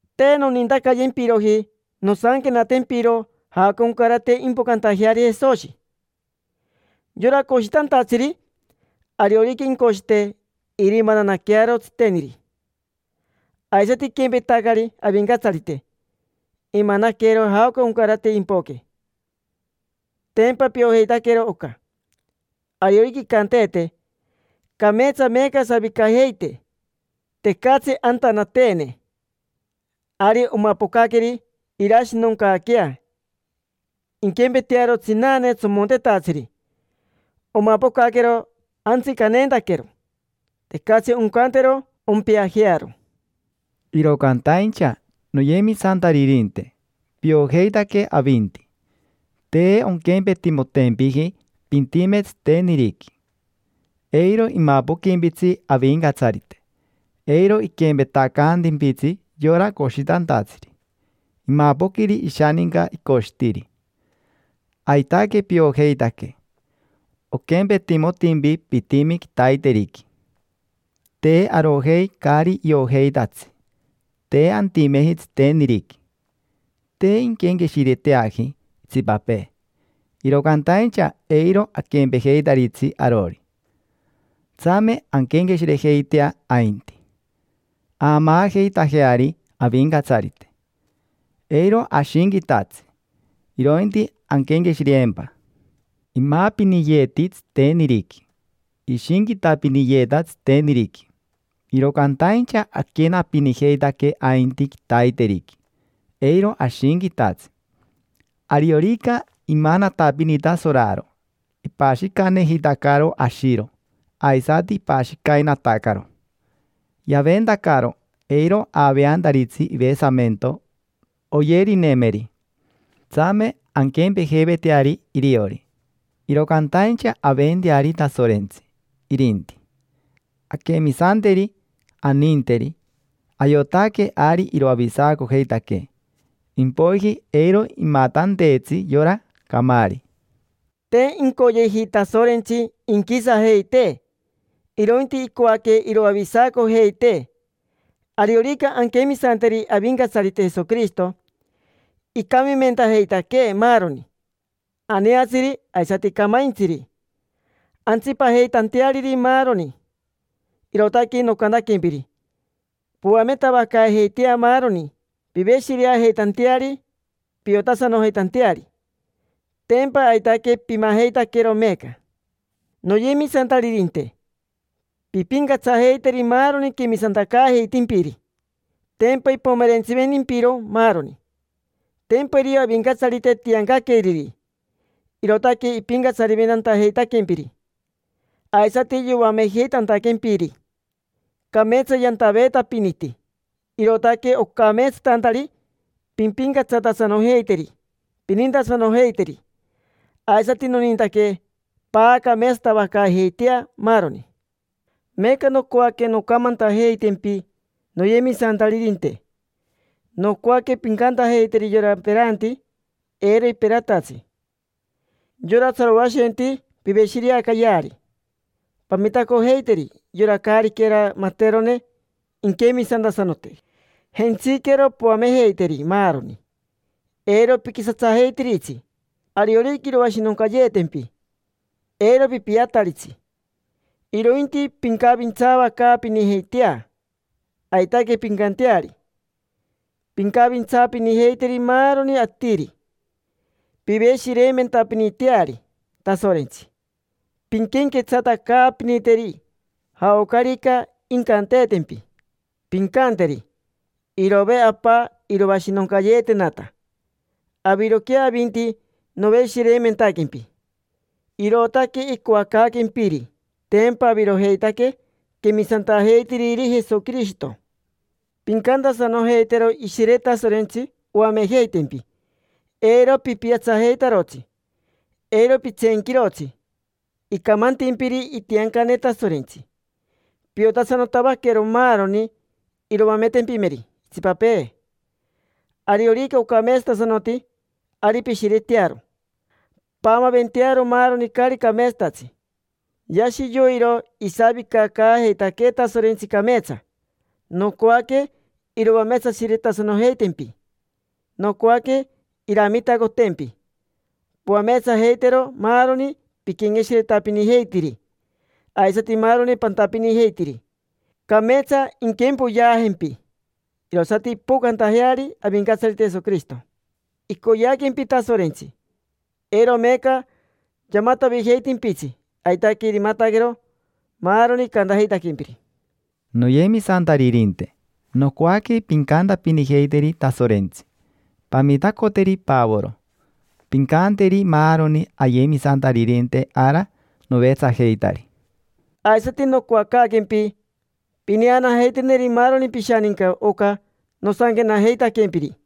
Te nonintacayempiroji nosanquenatempiro jaoca oncarate impocantajeari Jesoshi. Yora coshitantatsiri: ariorica incoshite, irimananaquearo tsiteniri. Aisati iquempetacari Avincatsarite, imanaquero jaoca oncarate impoque: tempa piojeitaquero oca. Ariorica incanteete: “Cameetsa meeca asavicajeite, tecatsi antanateene”, ari omapocaqueri irashinoncaaquea. Inquempetearo tsinane tsomontetatsiri. Omapocaquero antsicaneentaquero, tecatsi oncantero ompeajearo. Iro cantaincha, noyemisantaririnte, piojeitaque avinti: te onquempetimotempiji pintime tsiteniriqui. Eiro imapoquimpitsi Avincatsarite, eiro iquempetacaantimpitsi yora coshitantatsiri, imapoquiri ishaninca icoshitiri. Aitaque piojeitaque, oquempetimotimpi pitimi quitaiteriqui. Te arojei caari iojeitatsi, te antimeji tsiteniriqui. Te inquenqueshireteaji itsipapee, iro cantaincha eiro aquempejeitaritsi arori. Tsame anquenqueshirejeitea ainti, aamaajeitajeari Avincatsarite. Eiro ashinquitatsi, irointi anquenqueshireempa. Imaapiniyeeti tsiteniriqui, ishinquitapiniyeeta tsiteniriqui, iro cantaincha aquenapinijeitaque ainti quitaiteriqui, eiro ashinquitatsi. Ariorica imanatapinita soraro, ipashicanejitacaro ashiro, aisati ipashicainatacaro. Yaventacaro, eiro aveantaritsi ivesamento oyerinemeri. Tsame anquempejeiveteari iriori, iro cantaincha aventeari Tasorentsi, irinti: anquemisanteri, aninteri, ayotaque ari iroavisacojeitaquee, impoiji eiro imatanteetsi yora camaari. Te incoyeji Tasorentsi inquisajeitee, irointi icoaque iroavisacojeitee, ariorica anquemisanteri Avincatsarite Jesoquirishito. Icamimentajeitaquee maaroni, aneatsiri aisati camaintsiri, antsipajeitanteariri maaroni. Irootaque noncantantempiri: poametavacaajeitea maaroni piveshireajeitanteari, piotasanojeitanteari. Tempa aitaque pimajeitaquero meeca. Noyemisantaririnte, pimpincatsajeiteri maaroni quemisantacaajeitimpiri, tempa ipomerentsiventimpiro maaroni. Tempa irio Avincatsarite tiancaqueriri, irootaque ipincatsariventajeitantaquempiri aisati yoamejeitantaquempiri. Cameetsa yantaveetapiniti, irootaque ocameetsatantari pimpincatsatasanojeiteri, pinintasanojeiteri. Aisati nonintaque paacameetsatavacaajeitea maaroni. Meeca nocoaque noncamantajeitempi, noyemisantaririnte, nocoaque pincantajeiteri yora peranti eiro iperatatsi. Yora tsaroashenti, piveshireacayeari. Pamitacojeiteri yora caariquera materone inquemisantasanote. Jentsiquero poamejeiteri maaroni, eiro piquisatsajeitiritsi. Ariorica iroashinoncayeetempi, eiro pipiataritsi, irointi pincavintsaavacaapinijeitea. Aitaque pincanteari, pincavintsaapinijeiteri maaroni atiri. Piveshireimentapiniteari Tasorentsi, pinquenquetsatacaapiniteri. Jaocarica incanteetempi, pincanteri: “Irove, Apa, iroashinoncayeetenata; aviroquea avinti noveshireimentaquempi”, irootaque icoacaaquempiri. Tempa avirojeitaque quemisantajeitiriri Jesoquirishito. Pincantasanojeitero Ishire Tasorentsi oamejeitempi, eiro pipiatsajeitarotsi. Eiro pitseenquirotsi icamantimpiri itiancane Tasorentsi. Piotasanotavaquero maaroni iroametempimeri itsipapee. Ariorica ocameetsatasanoti, ari pishiretearo. Paamaaventearo maaroni caari cameetsatatsi. Yashi yoiro isavicacaajeitaquee Tasorentsi cameetsa. Nocoaque iroameetsashiretasanojeitempi. Nocoaque iramitacotempi poameetsajeitero maaroni piquenqueshiretapinijeitiri aisati maaroni pantapinijeitiri. Cameetsa inquempoyeajempi irosati impocantajeari Avincatsarite Jesoquirishito. Icoyeaquempi Tasorentsi, eiro meeca yamatavijeitimpitsi, aitaque irimataquero maaroni icantajeitaquempiri. Noyemisantaririnte, nocoaque pincantapinijeiteri Tasorentsi: “Pamitacoteri Pavoro”. Pincanteri maaroni ayemisantaririnte ara novetsajeitari. Aisati nocoacaaquempi pineanajeiteneri maaroni pishaninca oca nosanquenajeitaquempiri.